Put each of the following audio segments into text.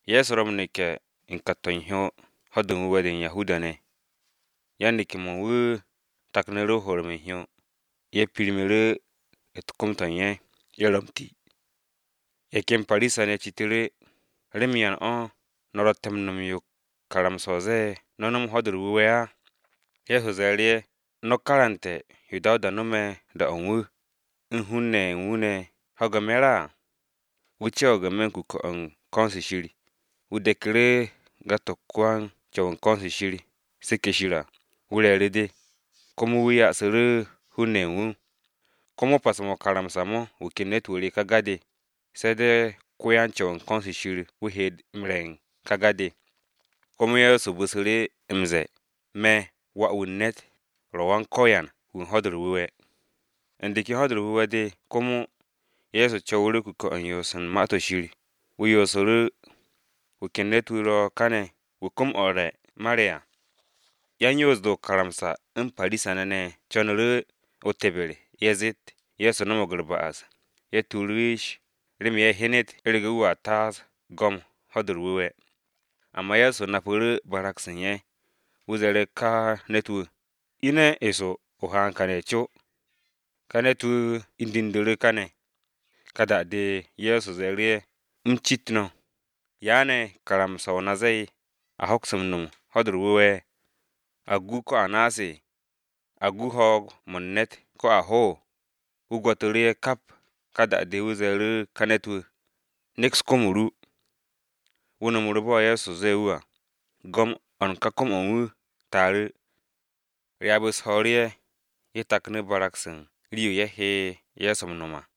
Ye̱so ro̱ m-neke̱ u̱n n-me̱ u̱n kat-to̱ u̱n hyo Ho̱-de u̱r-Wu̱we̱ de u̱n Yahuda-ne̱. Yan-neke̱-mo̱ u̱n wu̱ taknu̱ru̱ m-horom u̱n hyo, ye̱ pirmu̱ru̱ u̱t-kom to̱ u̱n ye̱, ye̱ ro̱ m-ti. Ye̱ ken Parisa-ne̱ citu̱ru̱, “¿Remen yan no̱ ro̱tte̱ m-no̱m yo karamsa-o ze̱e̱ no̱ no̱m Ho̱-de u̱r-Wu̱we̱ á?” Ye̱so shasu̱ru̱ ye̱, “No̱ karante̱ yo Dawuda no̱me̱ da-o̱ wu̱, u̱n hun-ne̱ ye̱ u̱n wu̱ ne̱ ho̱ge̱ me̱r à. Wu̱ co̱wo̱g n-me̱ u̱n de̱pi-o̱ u̱n ko̱n-se Shir, wu̱ deku̱ru̱ ga-de wan-Co̱w u̱n ko̱n-se Shirseke̱ Shir à, wu̱ re̱e̱ru̱ de, komo wu̱ ya'asu̱ru̱ hun-ne̱ ye̱ u̱n wu̱. Komo pas-mo̱ o-karamsa mo̱ wu̱ ken ne̱t-wu̱ re ka ga-de, se̱ de̱ wan-Co̱w u̱n ko̱n-se Shir wu̱ he m-re̱ u̱n ka ga-de.” Komo Ye̱so bu̱su̱ru̱ m-ze̱e̱, “Me̱ Wà-wu̱ u̱n ne̱t ro̱ Go̱s-wu̱ wu̱ u̱n Ho̱-de u̱r-Wu̱we̱.” U̱n de ken Ho̱-de u̱r-Wu̱we̱ de komo, Ye̱so co̱wu̱ru̱ kuke̱-o̱ u̱n yoos u̱n Ma-to̱ Shir, wu̱ yoosu̱ru̱. Wu̱ ken ne̱t-wu̱ ro̱ kane̱ wu̱ kom-o̱ u̱r-re̱ mare̱ à. Yan-Yoos-de o-karamsa u̱n Parisa-ne̱ ne̱ co̱nu̱ru̱ o-teber a zeet Ye̱so no̱mo̱g u̱r-ba'as, ye̱ tuuru̱ yish, remen ye̱ hyenet u̱rege̱ wu̱a taas go̱m Ho̱-de u̱r-Wu̱we̱. Amba Ye̱so napu̱ru̱ barag-se u̱n ye̱, wu̱ ze̱e̱ru̱ ka ne̱t-wu̱, “Ine̱ eso o haan kane̱ co.” Ka ne̱t-wu̱ indu̱ndu̱ru̱ kane̱. Ka da-de Ye̱so ze̱e̱ru̱ ye̱, “U̱m cit no̱: ¿Ya ne̱ karamsa-o na ze̱e̱, a hoks m-nom Ho̱-de u̱r-Wu̱we̱? ¿A gu ko a naase̱? ¿A gu ho̱o̱g-mo̱ u̱n ne̱t ko a ho?” Wu̱ gwo̱tu̱ru̱ ye̱ kap, ka da-de wu̱ ze̱e̱ru̱ ka ne̱t-wu̱, “Neks kom-o ru.” Wu̱ no̱mu̱ru̱ bo̱ Ye̱so ze̱e̱ wu̱ à, go̱m-o̱ u̱n kom-o̱ u̱n wu̱ taaru̱. Ryaab-u̱s ho̱o̱ru̱ ye̱, ye̱ taknu̱ barag-se u̱n rii-yo ye̱ he Ye̱so m-no̱m à.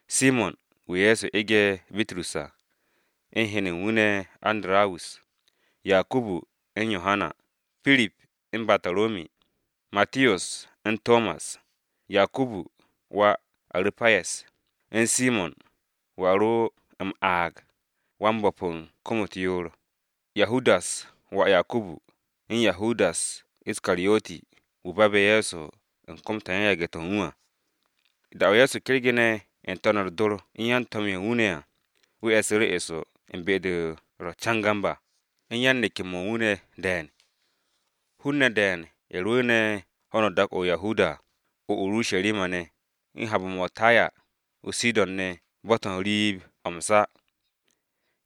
Simo̱n (wu̱ Ye̱so ege̱ Bitrus à), u̱n hen-ne̱ u̱n wu̱ ne̱ Andarawus, Yakubu, u̱n Yohana, Pirip u̱n Bataromi, Matiyos, u̱n Tomas, Yakubu (wà Aru̱payes), u̱n Simo̱n (wu̱ a ro̱ m-aag Wan-ya'as u̱r-hi), Yahudas (wà Yakubu), u̱n Yahudas Iskariyoti (wu̱ babe̱ Ye̱so u̱n kom-to̱ u̱n yan-yage̱-to̱ u̱n wu̱ à). Da-o̱ Ye̱so kergene̱ n-to̱n u̱r-dor u̱n yan-to̱m-ye̱ u̱n wu̱ ne̱ à, wu̱ e̱su̱ru̱ eso u̱n be-de ro̱ cangam à, u̱n yan-neke̱-mo̱ u̱n wu̱ ne̱ de̱e̱n. Hun-ne̱ de̱e̱n ye̱ rwu̱u̱ne̱ ho̱no dak-o̱ o-Judiya à, o-Urusharima ne̱, u̱n he̱be̱-mo̱ o-Taya, o-Sidon ne̱ bo̱-to̱ u̱n riib-o̱ m-sa.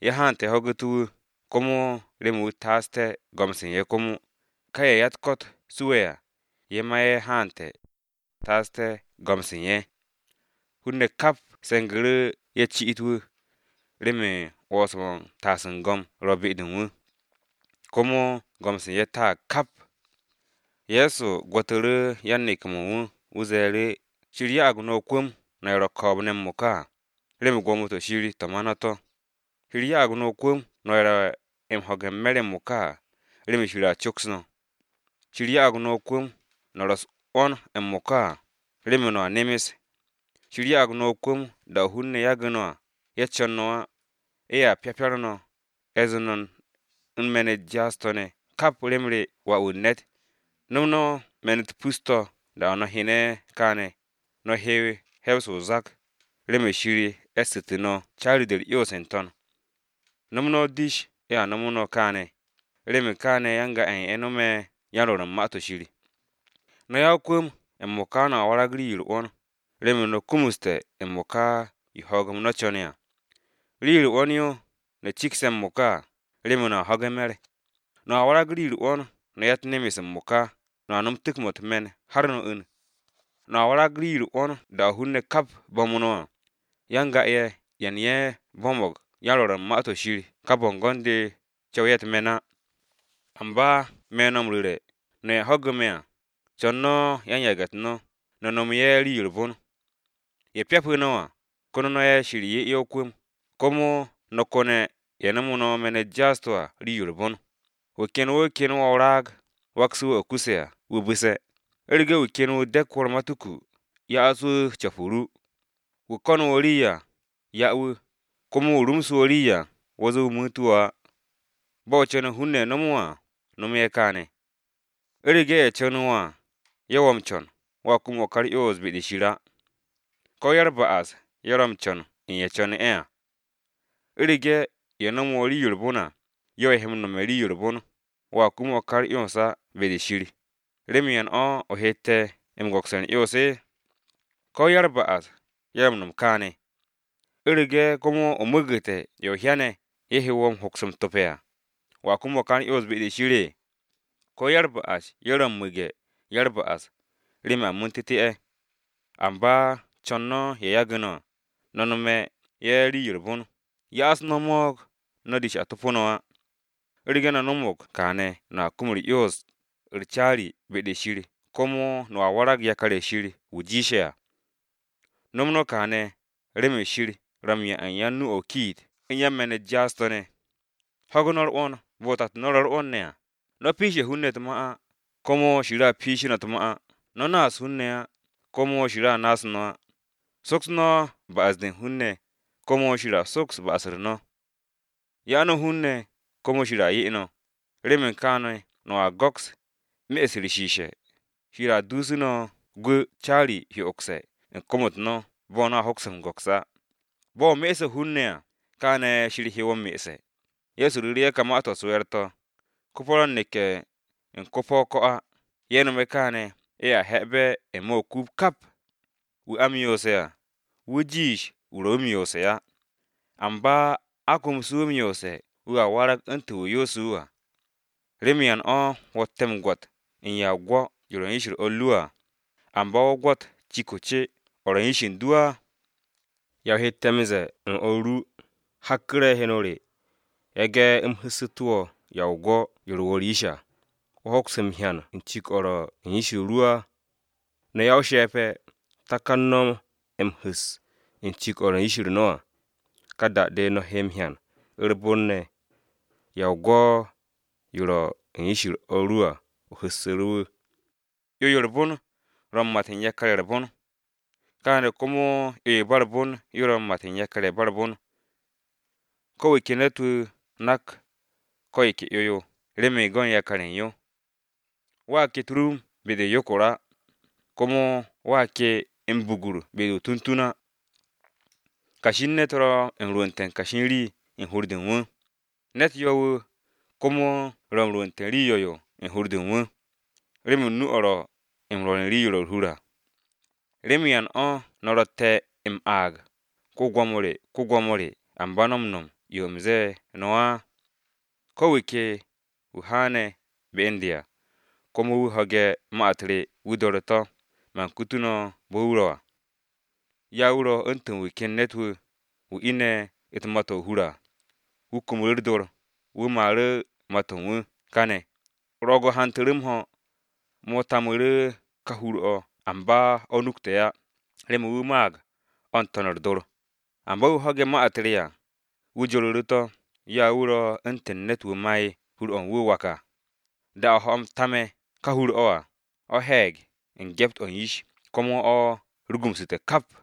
Ye̱ haante̱ ye̱ ho̱gu̱té̱ wu̱, komo remen wu̱ taasté̱ go̱m-se u̱n ye̱ komo, ka ye̱ ya-u̱t-ko̱t suwe̱ à, ye̱ ma ye̱ haante̱ Ye̱so taasté̱ go̱m-se u̱n ye̱. Hun-ne̱ kap se̱ngu̱ru̱ ye̱ ci'it wu̱, remen 'wo̱ns-mo̱ u̱n taas u̱n go̱m ro̱ be-de u̱n wu̱. Komo go̱m-se u̱n ye̱ taag kap. Ye̱so gwo̱tu̱ru̱ yan-neke̱-mo̱ u̱n wu̱, wu̱ ze̱e̱ru̱, “Shir ya'ag no̱ o-kwu̱m no̱ ye̱ ro̱ ko̱o̱b-ne̱ m-mo̱ka à, remen gwo̱mo-to̱ Shir to̱ ma no̱ to̱! Shir ya'ag no̱ o-kwu̱m no̱ ye̱ ro̱ m-ho̱ge̱ m-me̱r m-mo̱ka à, remen Shir a coks no̱! Shir ya'ag no̱ o-kwu̱m, no̱ ro̱ u̱s-'wo̱n m-mo̱ka à, remen no̱a nemes! Shir ya'ag no̱ o-kwu̱m da-o̱ hun-ne̱ yage̱ no̱ à, ye̱ co̱n no̱ á, ye̱a pyapar no̱, ye̱ zee no̱ u̱n me̱n-u̱t jaas-to̱ ne̱, kap rem re Wà-wu̱ u̱n ne̱t! “No̱m no̱ me̱n-u̱t pus-to̱ da-o̱ no̱ hyene̱ kaane̱, no̱ he̱w he̱w-se o-zak, remen Shir e̱ssu̱tu̱ no̱ caari-de u̱r-'yons n-to̱n. No̱m no̱ o-dish ye̱a nomo no̱ kaane̱, remen kaane̱ ya-n-ga-ye̱ no̱me̱ yan-rwo̱r u̱n Ma-to̱ Shir. “No̱ ya-o-kwu̱m m-mo̱ka no̱a warag rii-yo u̱r-'wo̱n, remen no̱ kumuste̱ m-mo̱ka, yo ho̱o̱g-m no̱ co̱ne̱ à! Rii-yo u̱r-'wo̱n yo, no̱ ye̱ cigse̱ m-mo̱ka à, remen no̱a ho̱ge̱ me̱r! No̱a warag rii-yo u̱r-'wo̱n, no̱ ya-u̱t-nemes m-mo̱ka, no̱a no̱m tu̱k-mo̱ u̱t-me̱n har no̱ 'u̱n. No̱a warag rii-yo u̱r-'wo̱n da-o̱ hun-ne̱ kap bo̱m no̱ à, ya-n-ga-ye̱, ye̱ u̱n ye̱ bo̱mo̱g yan-rwo̱r u̱n Ma-to̱ Shir ka bo̱ngo̱n-de co̱w ye̱ u̱t-me̱n á. “Amba me̱ no̱ m-ru̱re̱, no̱ ye̱ ho̱ge̱ me̱ à, co̱n no̱ yan-yage̱-u̱t no̱, no̱ nome̱ ye̱ rii-yo u̱r-bon. Ye̱ pyapu̱ no̱ à, no̱ ko̱ne̱ ye̱ Shir 'ye ye̱ o-kwu̱m, komo no̱ ko̱ne̱ ye̱ nomo no̱ me̱n-u̱t jaas-to̱ à rii-yo u̱r-bon. Wu̱ ken wu̱ kene̱ wo̱ o-raag, wakse̱ wu̱ o̱ kuse̱ à wu̱ bu̱se̱, u̱rege̱ wu̱ ken wu̱ de̱k wo̱ u̱r-matuku, ya'as wu̱ co̱p-o ru. Wu̱ ko̱nu̱ wo̱ rii à, 'ya wu̱, komo wu̱ rumsu̱ wo̱ rii à, wo̱ ze̱e̱ wu̱ mu̱u̱ntu̱ wo̱ á. Bo̱ o co̱ne̱ hun-ne̱ nomo wo̱ à, nomo ye̱ kaane̱. “U̱rege̱ ye̱ co̱nu̱ wo̱ à, ye̱ wo̱ m-co̱n, wo̱a kum o̱ ka u̱r-'yons be-de Shir á. Ko̱ ya-u̱r-ba'as-ye̱ ro̱ m-co̱n u̱n ye̱ co̱nu̱ ye̱ à! U̱rege̱ ye̱ nomo wo̱ rii-yo u̱r-bon à, ye̱ o he m-nome̱ rii-yo u̱r-bon, wo̱a kum o̱ ka u̱r-'yons á be-de Shir, ¿remen yan o̱ o hette̱ m-go̱ks u̱r-'yons? Ko̱ ya-u̱r-ba'as-ye̱ ro̱ m-no̱m kaane̱! U̱rege̱ komo o mu̱u̱gu̱te̱ ye̱ o hyane̱ ye̱ he wo̱ m-hoks m-tope̱ à, ¿wo̱a kum u̱r-'yons be-de Shir? Ko̱ ya-u̱r-ba'as-ye̱ ro̱ m-mu̱ge̱ ya-u̱r-ba'as, remen a mu̱u̱ntu̱te̱ ye̱! Amba co̱n no̱ ye̱ yagu̱ no̱ à, no̱ nome̱ ye̱ rii-yo u̱r-bon, ya'as no̱ mo̱o̱g, no̱ dish a topo no̱ á. U̱rege̱ no̱ no̱mo̱g kaane̱ no̱a kum 'yons-u̱r caari, be-de Shir komo no̱a warag yakar-ye̱ u̱n Shir wu̱ jiishe̱ à. No̱m no̱ kaane̱ remen Shir ro̱ m-'ya u̱n yan-nu-o̱ o-kiit u̱n yan-me̱n-u̱t jaas-to̱ ne̱. Ho̱gu̱ no̱ u̱r-'wo̱n bo̱ tato no̱ ro̱ u̱r-'wo̱n ne̱ à. “No̱ piishe̱ hun-ne̱ u̱t-ma á, komo Shir a piishu̱ no̱ u̱t-ma á. No̱ naas hun-ne̱ á, komo Shir a naas no̱ á. Soks no̱ ba'as-de u̱n hun-ne̱, komo Shir a soks ba'as-u̱r no̱. Ya no̱ hun-ne̱, komo Shir a 'ye no̱. Remen kaane̱ no̱a go̱ks, me'es u̱t-shishe̱, Shir a dusu̱ no̱ gwu̱ caari hyo'ogse̱ u̱n kom-u̱t no̱ bo̱ no̱a hoks m-go̱ks á. Bo̱ o me'esse̱ hun-ne̱ à, kaane̱ Shir he wo̱ m-me'esse̱.” Ye̱so ru̱ru̱ ye̱ ka ma-to̱ u̱s-we̱e̱r to̱: “Ko-po̱ ro̱ m-neke̱ u̱n ko-po̱ o-ko̱ á, ye̱ nome̱ kaane̱ ye̱a he̱be̱ n-me̱ o-kuub kap. Wu̱ a m-yoose̱ à, wu̱ jiish wu̱ ro̱ wu̱ m-yoose̱ á, amba a komse̱ wu̱ m-yoose̱ wu̱a warag u̱ntu̱n wu̱ yoose̱ wu̱ à. “¿Remen yan o̱ wo̱tte̱ m-gwo̱t u̱n ya o-gwo̱ yo ro̱ u̱n yish-u̱r o̱r ru à, amba wo̱ gwo̱t cik-o̱ o-ce o̱ ro̱ n-me̱ u̱n yish u̱n du á? ¿Ya o hette̱ m-ze̱e̱ u̱n o̱r ru, ‘Hakku̱re̱, heno re, yage̱ u̱m hu̱ssu̱tu̱ wo̱ ya o-gwo̱ yo ro̱ wo̱ u̱r-yish à,’ wo̱ hoks m-hyan u̱n cik-o̱ ro̱ u̱n yish ru á? No̱ ya-o-she̱pe̱! Takan no̱ m-hu̱s u̱n cik-o̱ ro̱ u̱n yish no̱ à, ka da-de no̱ he m-hyan u̱r-bon ne̱ ya o-gwo̱ yo ro̱ u̱n yish o̱r ru à o hu̱ssu̱ru̱ wu̱. “'Yo, yo u̱r-bon ro̱ m-mat u̱n yakar-ye̱ u̱r-bon, kaane̱ komo 'yo-yo ba u̱r-bon yo a met yakar-ye̱ ba u̱r-bon. Ko̱ wu̱ ke ne̱t-wu̱ nak ko̱ yo ke 'yo-yo remen go̱n yakar-ye̱ u̱n yo. Wo̱a ke u̱t-rum be-de o-yokor á, komo wo̱a ke m-bugur be-de o-tuntun á. Kashi u̱n ne̱t ro̱ m-rwu̱nte̱ kashi u̱n rii u̱n hur-de u̱n wu̱, ne̱t yo̱-wu̱, komo ro̱ m-rwu̱nte̱ rii 'yo̱-yo u̱n hur-de u̱n wu̱, remen nu-o̱ ro̱ m-rwo̱r u̱n rii-yo ro̱ u̱r-hur à. “¿Remen yan o̱ no̱ ro̱tte̱ me̱ m-aag, ‘Go̱s-wu̱, Go̱s-wu̱,’ amba no̱ m-no̱m yo u̱m ze̱e̱ no̱ á? Ko̱ wu̱ ke wu̱ haane̱ be u̱n de à, komo wu̱ ho̱ge̱ ma-u̱t re wu̱ do̱re̱ to̱, man kutu̱ no̱ bo̱ wu̱ ro̱ à. Ya wu̱ ro̱ u̱ntu̱n wu̱ ken ne̱t-wu̱, wu̱ ine̱ u̱t-ma to̱ o-hur à, wu̱ kumu u̱r-dor, wu̱ maaru̱ ma-to̱ u̱n wu̱ kane̱. Ro̱o̱g-o̱ hantu̱ru̱ m-ho̱, mo̱ tamu̱ru̱ ka hur-o̱ amba o̱ nukte̱ á, remen wu̱ maag o̱ n-to̱n u̱r-dor. Amba wu̱ ho̱ge̱ ma-u̱t re à, wu̱ joru̱ru̱ to̱, ya wu̱ ro̱ u̱ntu̱n ne̱t-wu̱ ma'e̱ hur-o̱ u̱n wu̱ o-wak à, da-o̱ ho̱-m taame̱ ka hur-o̱ à, o̱ he̱e̱g u̱n gyept-o̱ u̱n yish, komo o̱ rugumsu̱te̱ kap.”